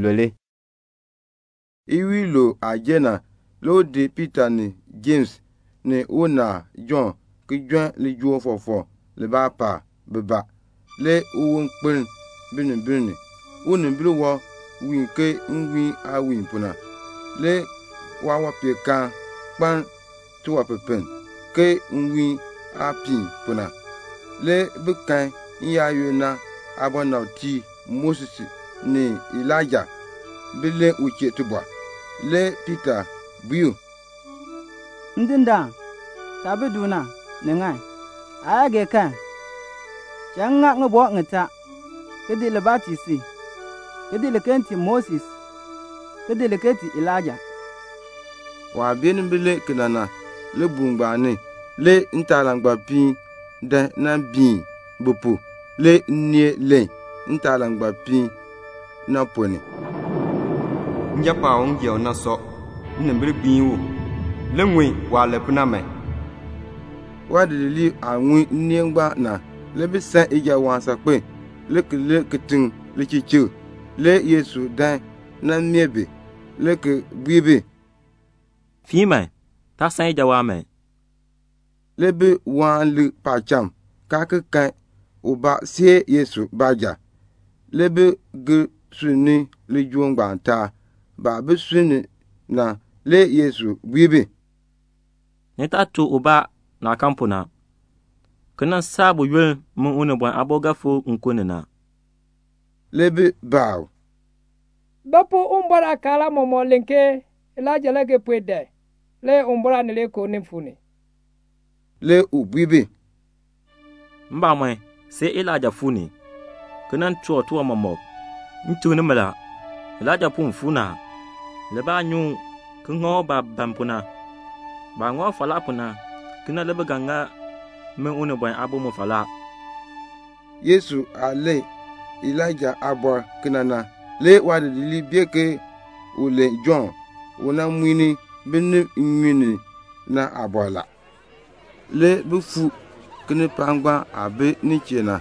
Le iwiin iluub jer. Le u di Piita ni Jems ni unaal Jɔnn le ki di jon lijool fɔfɔk paab bibaa. Le uwon kpeln binimbil ni. Unimbil wɔb wiin ke nwiin aah wiin pu na. Le waawanpeenkaan kpaln tiwanpipiln ke nwiihn aah piin pu na. Le bi kan n-yaayoonn na aabɔnabtiib Moses ni Elaija bi len u chee tibɔr. Le Piita bui u, "Ndindaan, taah bi du na, ni ŋan. Aa yaa gee kan, cha m ŋa ŋibɔk ŋitaa, ki di libaa ki tii si, ki di liken ki tii Moses, ki di liken ki tii Elaija." Waah beenin len kena na, libuul ngbaan ni le ntaalangbapiin biin bi pu. Le nneel len ntaalangbapiin na ponn ni, "Njapɔɔn u m gee u na sɔ. Nnimbil gbiin u. Li ŋun waah len pu na man." Waadidiliib aah ŋun nneel ngbaan na, le bi san ijawaan saakpen, le ki di binimbil chiŋ kitiŋ. Le Yesu dan nan meeh bi, le ki bui bi, "Fiin. Taa san ijawaan man." Le bi lik paacham, kaa kan ubaa see Yesu baanja. Le bi gir sunn ni lijool ngbaan taab. Baah bi sunni na, le Yesu bui bi, "Ni taa tuk ubaa naah kan pu na, ki nan saa buyoonn min Unibɔn Aabo ga fikr nkun ni na." Le bi baa u, "Ba pu Uwumbɔr aakaal aamɔmɔkb len ke Elaija le ga puen dan le Uwumbɔr Aanileekoo nin fuu ni?" Le u bui bi, "Mbamɔn, see Elaija fuu ni, ki nan toor tiwan mɔmɔk. M tuk nimi la, Elaija puen fuu ni a. Le baa nyi u, ki ŋa u baah ban pu na. Baah ŋa u falaa pu na, kena le bi ga ŋa min Unibɔn Aabo mu falaa." Yesu aah len Elaija pu kena na, le waadidiliib bee ke u len Jɔnn u nan muin binib nnyun ni na aabɔr la. Le bi fuu kinipaak ngbaan aah bi nin chee na.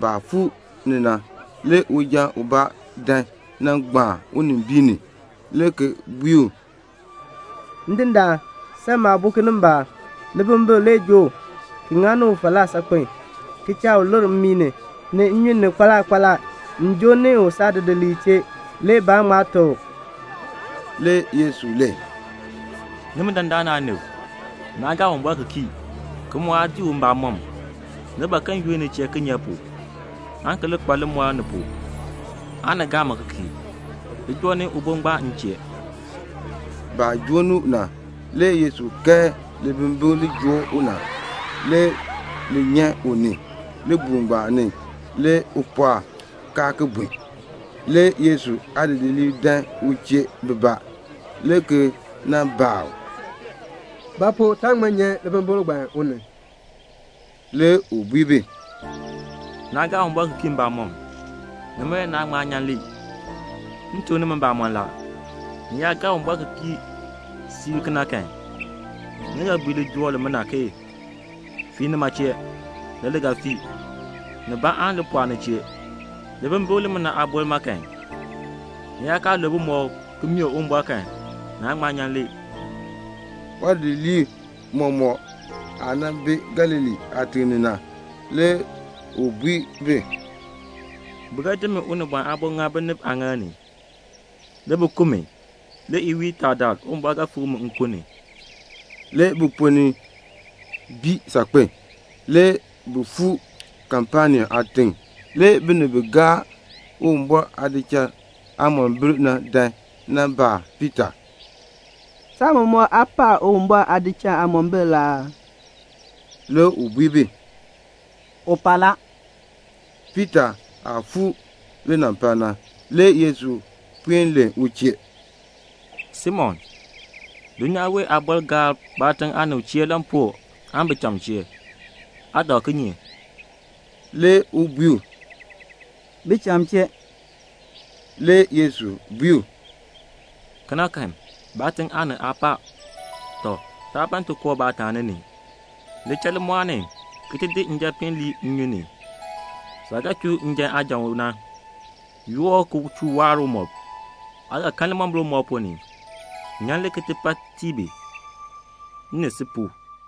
Baah fuu ni na, le uja ubaa dan nan gbaan unimbiin ni, le ki bui u, "Ndindaan, san maabo kinimbaak. Libimbikl le joo u, ki ŋa u falaa saakpen, ki cha u lir mmii ni, ni nnyun ni kpaala kpaala. Le m joo ni u saadidiliib chee, le baa ŋma teb u." Le Yesu len, "Nimi dandana aanib, naa gaa Uwumbɔr ki kii, ki mu aa dii u mbamɔm. Ni ban ke m yunn ni chee kinye pu, aan ki li kpa limɔr ni pu, aan ni gaa mi ki kii? Li joo ni ubo ngbaan m chee." Baah joo ni u na, le Yesu kae libimbikl li joo u na. Le li nyan u ni. Libuul ngbaan ni le u pɔɔk, kaa ki bun. Le Yesu aadidiliib dan u chee bibaa, le ki baa u, "Ba pu taa ŋma nyan libimbikl ngbaan u ni?" Le u bui bi, "Naa gaa Uwumbɔr ki kii mbamɔm. Nima le naa ŋma nyan li. M tuk nimi mbamɔn la, ni yaa gaa Uwumbɔr ki kii siib kan, ni ga bui lijool ngbaan, 'Fii nima chee,' le li ga fii. Nibaa aan li pɔɔ ni chee. [ Libimbikl limina aaboln ma kan, ni yaa kaa lul bumɔb ki mee Uwumbɔr kan, naan ŋma nyan li.]" Le waadidiliib mɔmɔk aah bi Galilee aatiŋ ni na, le u bui bi, "Bi ga di min Unibɔn Aabo ki di ŋa binib aaŋaal ni, le bi ku mi. Le iwiin itaadaal Uwumbɔr ga fikr mi nkun ni." Le biponn bii saakpen a. Le bi fuu Kapenaum aatiŋ. Le binib bi gaar Uwumbɔr aadichal aamombil na dan nan baa Piita, "Saatiicha aa pa Uwumbɔr aadichal aamombil aa?" Le u bui bi, "U pa la." Le Piita aah fuu linampal na, le Yesu puen len u chee, "Simon, dulnyaa wee aabɔrb gaar baatiŋ aanib chee lampuu aan bicham chee? Aa dak kinye?" Le u bui u, "Bicham chee." Le Yesu bui u, "Kena kan, baatiŋ aanib aa pa. Tɔ, taa ban ti koo baataani ni. Li cha limɔɔl ni ki ti di njapiin lii nnyun ni. Saah ga chuu njan aajan u na, yoor u ki chuu waar umɔb. Le aa ga kan limombil umɔb ponn ni. Yoor li ki ti pa tii bi, m ni si pu."